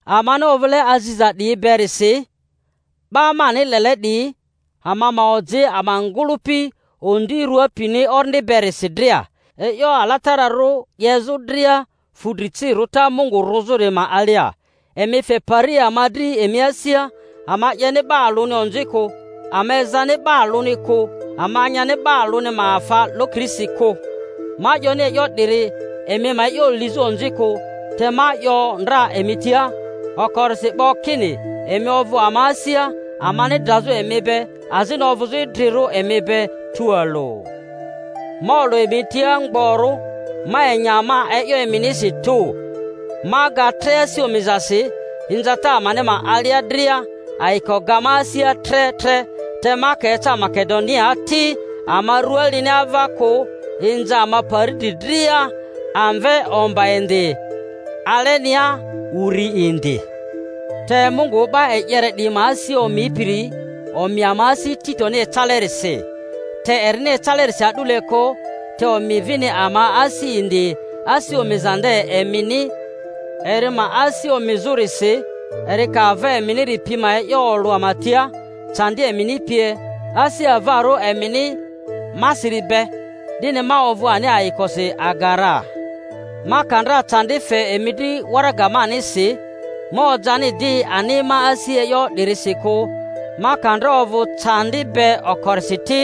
Amani ovᴜle aziza 'diyi berisi, 'ba mani lele 'diyi, ama ma oji ama ngᴜlᴜpi ondi rua pini orindi berisi dria, e'yo alatararᴜ 'yezᴜ dria fu dri ci rᴜta Mungu rᴜzᴜri ma alia. Emi fe pari ama dri emi asia; ama 'yeni 'ba alᴜni onzi kᴜ, ama ezani 'ba alᴜni kᴜ, ama nyani 'ba alᴜni ma afa lokirisi kᴜ. Ma 'yoni e'yo 'diri emi ma e'yo lizᴜ onzi kᴜ, te ma 'yo ndra emi tia okorisi 'bo kini emi ovᴜ ama asia, amani drazᴜ emi be azini ovᴜzᴜ idrirᴜ emi be tualᴜ. Ma olᴜ emi tia mgborᴜ, ma enya ma e'yo eminisi tᴜ; ma ga tre asi omizasi. Inzata amani ma alia dria, ayiko ga ma asia tre tre. Te ama ka eca Makedoniaa ti, ama rua lini ava kᴜ, inza ama pari dri dria—amve omba indi, alenia uri indi. Te Mungu 'ba e'yere 'diyi ma asi omipiri omi ama asi Titoni ecalerisi; te erini ecalerisi a'dule kᴜ, te omi vini ama asi indi asi omiza nde emini eri ma asi omizᴜrisi, eri ka ava eminiri pi ma e'yo olᴜ ama tia, candi emini pie, asi avarᴜ emini masiri be, 'dini ma ovᴜ ani ayikosi aga ra. Ma ka ndra candi fe emi dri waraga manisi, ma ojani di ani ma asi e'yo 'dirisi kᴜ, ma ka ndra ovᴜ candi be okorisi ti,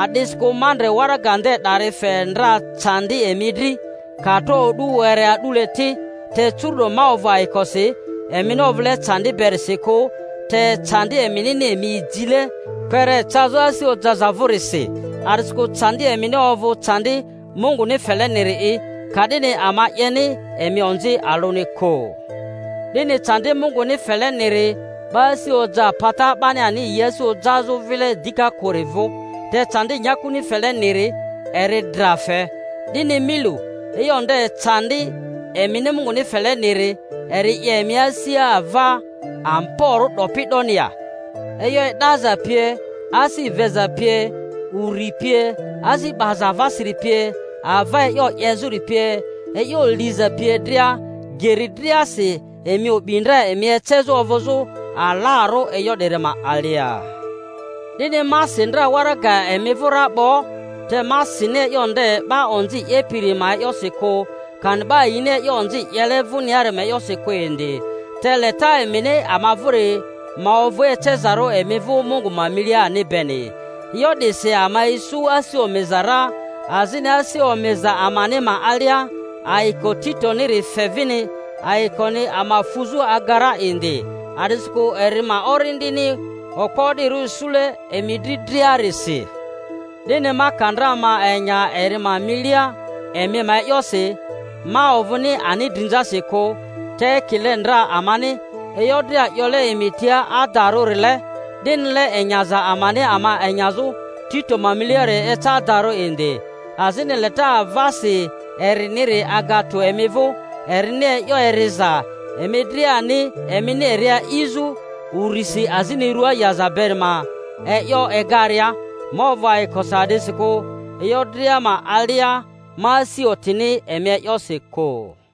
a'disikᴜ ma ndre waraga nde 'dari fe ndra candi emi dri, ka tro o'du were a'dule ti. Te curu'do ma ovᴜ ayikosi, emini ovᴜle candi berisi kᴜ, te candi eminini emi jile kpere cazᴜ asi ojaza vᴜrisi; a'disikᴜ candi emini ovᴜ candi Munguni feleniri'i, ka'dini ama 'yeni emi onzi alᴜni kᴜ. 'Dini candi Munguni feleniri 'ba asi oja pata 'bani ani yi asi ojazᴜ vile dika kᴜri vᴜ; te candi nyakuni fele-niri eri dra fe. 'Dini mi lu, e'yo nde candi emini Munguni feleniri, eri 'ye emi asia ava amborᴜ 'dopi 'doni ya, e'yo e'daza pie, asi veza pie, uri pie, asi 'baza avasiri pie^ ava e'yo 'yezᴜri pie, e'yo liza pie dria! Geri driasi emi o'bi ndra emi ecezᴜ ovᴜzᴜ alarᴜ e'yo 'diri ma alia. 'Dini ma si ndra waraga emi vᴜ ra 'bo, te ma sini e'yo nde 'ba onzi 'yepiri ma e'yosi kᴜ, kani 'ba yini e'yo onzi 'yele vᴜniari ma e'yosi kᴜ indi, te leta emini ama vᴜri ma ovᴜ ecezarᴜ emi vᴜ Mungu ma milia ani beni. E'yo 'disi ama isu asi omiza ra. Azini asi omiza amani ma alia. ayiko Titoniri fe vini ayikoni ama fuzᴜ aga ra indi, a'disikᴜ eri ma orindini okpo o'dirᴜ isule emi dri driarisi. 'Dini ma ka ndra ma enya eri ma milia emi ma e'yosi, ma ovᴜni ani drinzasi kᴜ; te ekile ndra amani e'yo dria 'yole emi tia adarᴜ-rile, 'dinile enyaza amani ama enyazᴜ Tito ma miliari eca adarᴜ indi. Azini leta avasi eriniri aga tᴜ emi vᴜ, erini e'yo eriza emi driani emini eri a'izᴜ urisi azini rua yaza beri ma e'yo egaria. Ma ovᴜ ayikosi a'disikᴜ e'yo dria ma alia ma asi otini emi e'yosi kᴜ.